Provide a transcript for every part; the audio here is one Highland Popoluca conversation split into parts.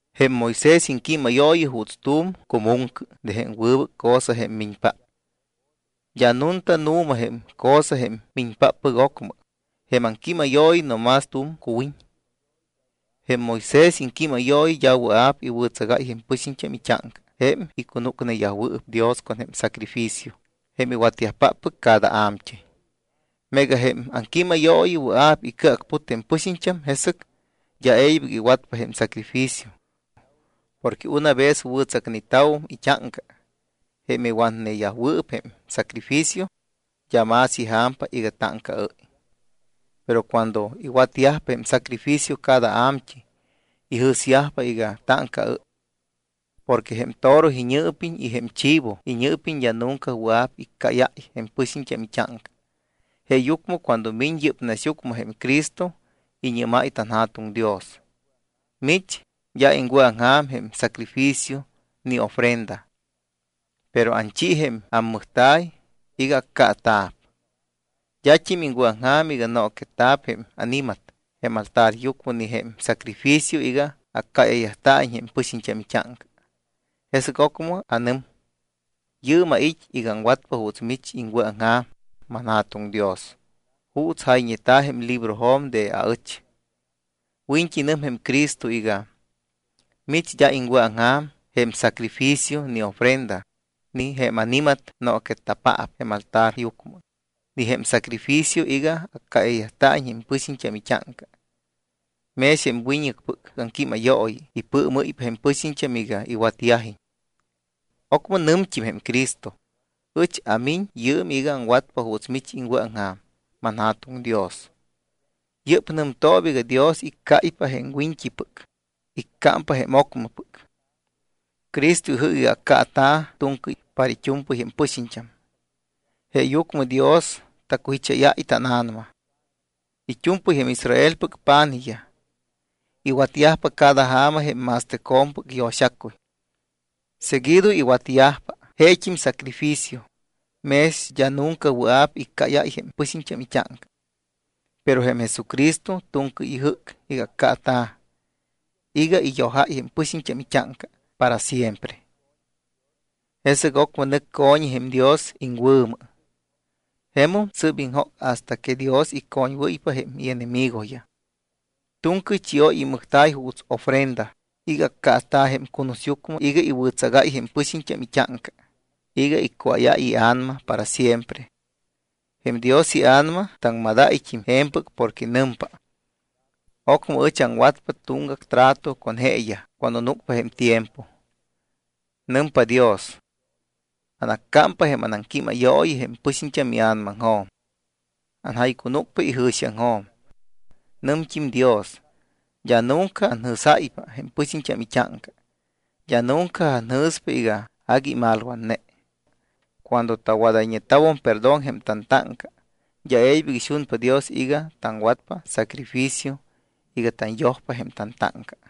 Jém Moisés iŋquímayooyi juuts tu̱m cumuŋcɨ de jém wɨbɨc cosa jém miñpáppɨc. D́a nunta nu̱ma jém cosa jém miñpáppɨc ocmɨ, jém aŋquímayooyi no más tu̱m cuwiñ. Jém Moisés iŋquímayooyi d́a wɨa̱p iwɨ̱tsagáy jém pɨxiñt́am it́áŋca jém icunúcneyajwɨɨp Dios con jém sacrificio jém iwatyajpáppɨc cada a̱mt́ɨy. Meega jém aŋquímayooyi wɨa̱p icɨacput jém pɨxiñt́am, jesɨc d́a e̱ybɨc iwatyajpa jém sacrificio porque una vez wɨ̱tsacneta̱wum it́áŋca jém iwatneyajwɨɨp jém sacrificio, d́a más ija̱mpa iga táŋcaɨ́y. Pero cuando iwatyajpa jém sacrificio cada a̱mt́ɨy, ijɨ̱syajpa iga táŋcaɨ́y. Porque jém toro iñɨɨpiñ y jém chivo iñɨɨpiñ d́a nunca wɨa̱p iccáyáy jém pɨxiñt́am it́áŋca. Jeeyucmɨ cuando miñ yɨ́p naxyucmɨ jém Cristo, iñɨ́máy tanJa̱tuŋ Dios: Mich d́a iŋwɨ̱aŋja̱m jém sacrificio ni ofrenda. Pero anchi jém ammɨjta̱y iga accaata̱p. D́at́im iŋwɨ̱aŋja̱m iga nooquetta̱p jém ani̱mat jém altaryucmɨ ni jém sacrificio iga accáyayt́a̱iñ jém pɨxiñt́am it́áŋca. Jesɨc ocmɨ anɨm: “Yɨɨm ait́ iga aŋwatpa juuts mich iŋwɨ̱aŋja̱m, manJa̱tuŋ Dios, juuts jayñeta̱ jém librojo̱m de aɨch.” Wiñt́i nɨm jém Cristo iga: “Mich d́a iŋwɨ̱aŋja̱m jém sacrificio, ni ofrenda, ni jém ani̱mat nooquetta̱paap jém altaryucmɨ, ni jém sacrificio iga accáyayt́a̱iñ jém pɨxiñt́am it́áŋca.” Mex jém wiñɨcpɨc aŋquímayooyi ipɨɨmɨ́ypa jém pɨxiñt́am iga iwatyajiñ. Ocmɨ nɨmt́im jém Cristo: “Ɨch amiñ yɨɨm iga aŋwatpa juuts mich iŋwɨ̱aŋja̱m, manJa̱tuŋ Dios.” Yɨ́p nɨmtooba iga Dios iccáypa jém wiñt́ipɨc, iccámpa jém ocmɨpɨc. Cristo ijɨ́c iga accaata̱ tu̱ŋcɨy para it́u̱mpɨy jém pɨxiñt́am. Jeeyucmɨ Dios tacujicháyáy tána̱nama. It́u̱mpɨy jém Israelpɨc pa̱nijyaj iwatyajpa cada ja̱ma jém ma̱stɨcjo̱mpɨc yo̱xacuy. Seguido iwatyajpa jeet́im sacrificio, mex d́a nunca wɨa̱p iccáyáy jém pɨxiñt́am it́áŋca. Pero jém Jesucristo tu̱ŋcɨy ijɨ́c iga accaata̱ iga iyojáy jém pɨxiñt́am it́áŋca para siempre. Jesɨc ocmɨ nɨc co̱ñi jém Dios iŋwɨ̱mɨ. Jemum sɨ́p iŋjóc hasta que Dios icoñwɨ́ypa jém ienemigoyaj. Tu̱ŋcɨy chióy imɨjta̱y juuts ofrenda iga accaata̱ jém cunusyucmɨ iga iwɨ̱tsagáy jém pɨxiñt́am it́áŋca iga iccuáyáy ia̱nama para siempre. Jém Dios iA̱nama taŋmadáyt́im je̱mpɨc porque nɨmpa: Ocmɨ ɨch aŋwatpa tuŋgac trato con jeeyaj cuando núcpa jém tiempo. Nɨmpa Dios: Anaccámpa jém anaŋquímayooyi jém pɨxiñt́am ia̱namaŋjo̱m. Anjaycunúcpa ijɨ̱xiaŋjo̱m. Nɨmt́im Dios: D́a nunca anjɨ̱sáypa jém pɨxiñt́am it́áŋca, d́a nunca anjɨ̱spa iga agui imalwatne. Cuando tawadayñeta̱wum perdón jém tantáŋca, d́a e̱ybɨc ixunpa Dios iga taŋwatpa sacrificio iga tanyojpa jém tantáŋca.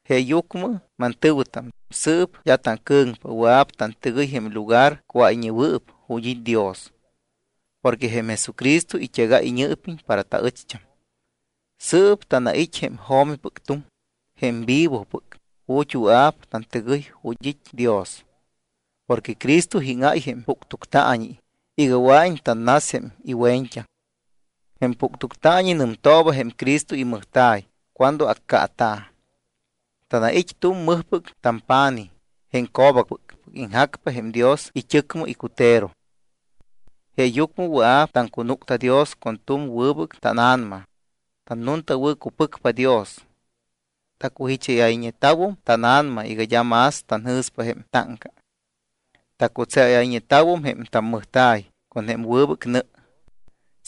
Jeeyucmɨ mantɨ̱wɨtam, sɨɨp d́a tacɨ̱ŋpa. Wɨa̱p tantɨgɨy jém Lugar Cuáyñewɨɨp, ju̱t́ it́ Dios, porque jém Jesucristo it́egáy iñɨɨpiñ para taɨcht́am. Sɨɨp tanait́ jém jo̱mipɨc tuŋ, jém vivopɨc, ju̱t́ wɨa̱p tantɨgɨy ju̱t́ it́ Dios. Porque Cristo íŋáy jém puctuctaañi iga wɨa̱iñ tannas jém iwe̱ñt́aŋ. Jém puctuctaañi nɨmtooba jém Cristo imɨjta̱y cuando accaata̱. Tanait́ tu̱m mɨjpɨc tampa̱nij, jém co̱bacpɨc, iŋjacpa jém Dios it́ɨcmɨ icutero. Jeeyucmɨ wɨa̱p taŋcunúcta Dios con tu̱m wɨbɨc tána̱nama, tannuntawɨ̱cupɨcpa Dios. Tacujicháyayñeta̱wum tána̱nama iga d́a más tanjɨ̱spa jém tantáŋca. Tacutseayñeta̱wum jém tammɨjta̱y con jém wɨbɨc nɨ.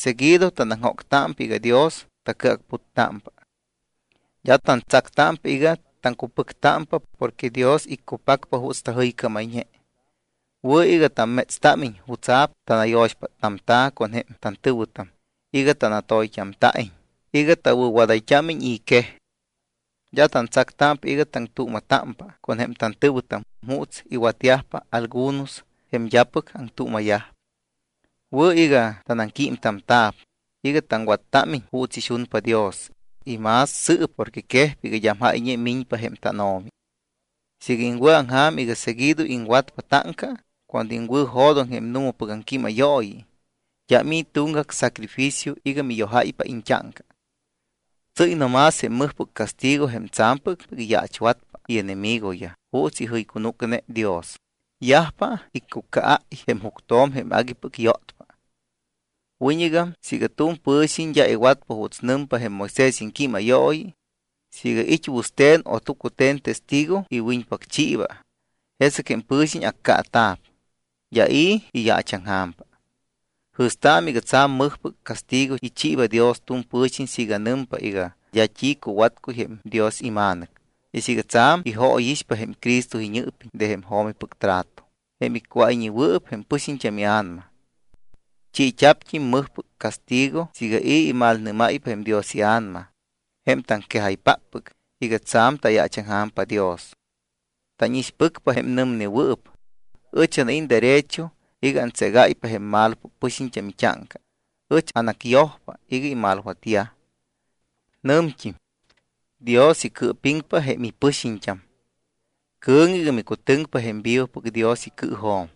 Seguido tanaŋjóctámpa iga Dios tacɨacputtámpa. D́a tantsactámpa iga taŋcupɨctámpa porque Dios iccupacpa juuts tajɨycámayñe. Wɨ̱ iga tammétstámiñ jutsa̱p tanayo̱xpáttamta̱ con jém tantɨ̱wɨtam iga tanatoyt́amta̱iñ, iga tawɨ̱wadayt́ámiñ i̱ quej. D́a tantsactámpa iga taŋtuuma̱támpa con jém tantɨ̱wɨtam juuts iwatyajpa algunos jém d́apɨc aŋtuuma̱yajpa. Wɨ̱ iga tanaŋquímtamta̱p iga taŋwattámiñ juuts ixunpa Dios y más sɨɨp porque quejpa iga d́am jáyñe miñpa jém tánO̱mi. Siiga iŋwɨ̱aŋja̱m iga seguido iŋwatpa táŋca cuando iŋwɨ̱jo̱doŋ jém nu̱mapɨc aŋquímayooyi, d́am i̱ tuŋgac sacrificio iga miyojáypa iñt́áŋca. Tsɨ́y no más jém mɨjpɨc castigo jém tsa̱mpɨc iyaachwatpa ienemigoyaj juuts ijɨycunúcne Dios, yajpa iccucaáy jém juctjo̱m jém aguipɨc yótpa. Wiñɨgam siiga tu̱m pɨ̱xiñ d́a iwatpa juuts nɨmpa jém Moisés iŋquímayooyi, siiga it́ wɨste̱n o tucute̱n testigo iwiñpacchiiba, jesɨc jém pɨ̱xiñ accaata̱p, d́a i̱ iyaachaŋja̱mpa. Jɨ̱staamɨ iga tsa̱m mɨjpɨc castigo ichiiba Dios tu̱m pɨ̱xiñ siiga nɨmpa iga d́a t́i cuwatcuy jém Dios iMa̱nɨc, y siiga tsa̱m ijóyixpa jém Cristo iñɨɨpiñ de jém jo̱mipɨc trato, jém iccuáyñewɨɨp jém pɨ̱xiñ ia̱nama. Chiit́a̱pt́im mɨjpɨc castigo siiga i̱ imalnɨ́máypa jém Dios iA̱nama jém taŋquejaypáppɨc iga tsa̱m tayaachaŋja̱mpa Dios. Tánixpɨcpa jém nɨmnewɨɨp: “Ɨch anait́ derecho iga antségáypa jém malopɨc pɨxiñt́am it́áŋca, ɨch anacyojpa iga imalwatyaj.” Nɨmt́im: “Dios icɨɨpiŋpa jém ipɨxiñt́am.” Cɨ̱ŋɨ iga micutɨŋpa jém vivopɨc Dios icɨɨjo̱m.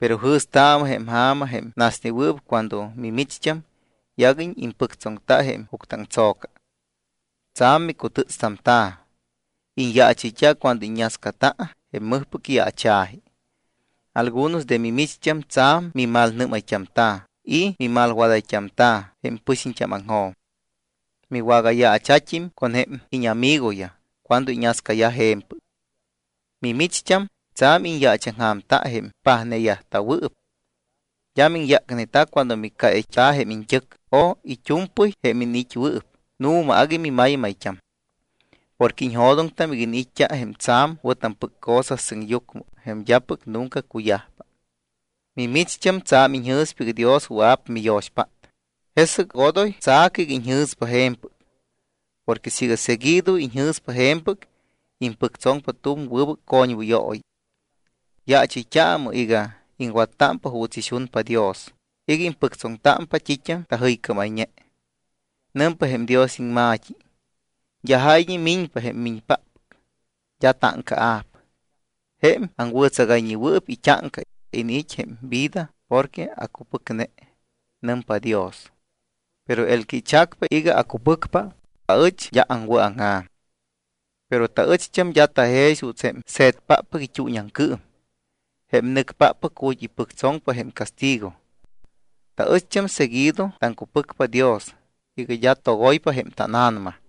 Pero jɨ̱staamɨ jém ja̱ma jém nasnewɨɨp cuando mimicht́am yaguiñ impɨctsoŋta jém juctɨaŋtso̱ca. Tsa̱m micutɨ́tstamta̱. Iñyaachɨyt́a cuando iññascata jém mɨjpɨc yaacha̱ji. Algunos de mimicht́am tsa̱m mimalnɨ́mayt́amta̱ y mimalwadayt́amta̱ jém pɨxiñt́ámaŋjo̱m. Miwagayaacha̱t́im con jém íñamigoyaj cuando iñascayaj je̱mpɨc. Mimicht́am, tsa̱m iñyaachaŋja̱mta jém pajneyajta̱wɨɨp. D́a miŋyácneta cuando miccáyayt́a̱ jém iñt́ɨc o it́u̱mpɨy jém iniit́wɨɨp, nu̱ma agui mimaymayt́am. Porque iñjo̱doŋtam iga iniit́t́a jém tsa̱m wɨ̱tampɨc cosa sɨŋyucmɨ jém d́apɨc nunca cuyajpa. Mimicht́am tsa̱m iñjɨ̱spa iga Dios wɨa̱p miyo̱xpát, jesɨc odoy tsa̱cɨ iga iñjɨ̱spa je̱mpɨc porque siiga seguido iñjɨ̱spa je̱mpɨc, impɨctsoŋpa tu̱m wɨbɨc coñwɨyooyi. Yaachɨyt́aamɨ iga iŋwattámpa juuts ixunpa Dios iga impɨctsoŋtámpa t́it́am tajɨycámayñe. Nɨmpa jém Dios iŋma̱t́i: D́a jáyñe miñpa jém miñpáppɨc. D́a táŋcaa̱p. Jém aŋwɨ̱tsagayñewɨɨp it́áŋca iniit́ jém vida porque acupɨcne, nɨmpa Dios. Pero el que ichacpa iga acupɨcpa, aɨch d́a aŋwɨ̱aŋja̱m. Pero taɨcht́am d́a tajex juuts jém se̱tpáppɨc it́uuñiaŋcɨɨm, jém nɨcpáppɨc ju̱t́ ipɨctsoŋpa jém castigo. Taɨcht́am seguido taŋcupɨcpa Dios iga d́a togoypa jém tána̱nama.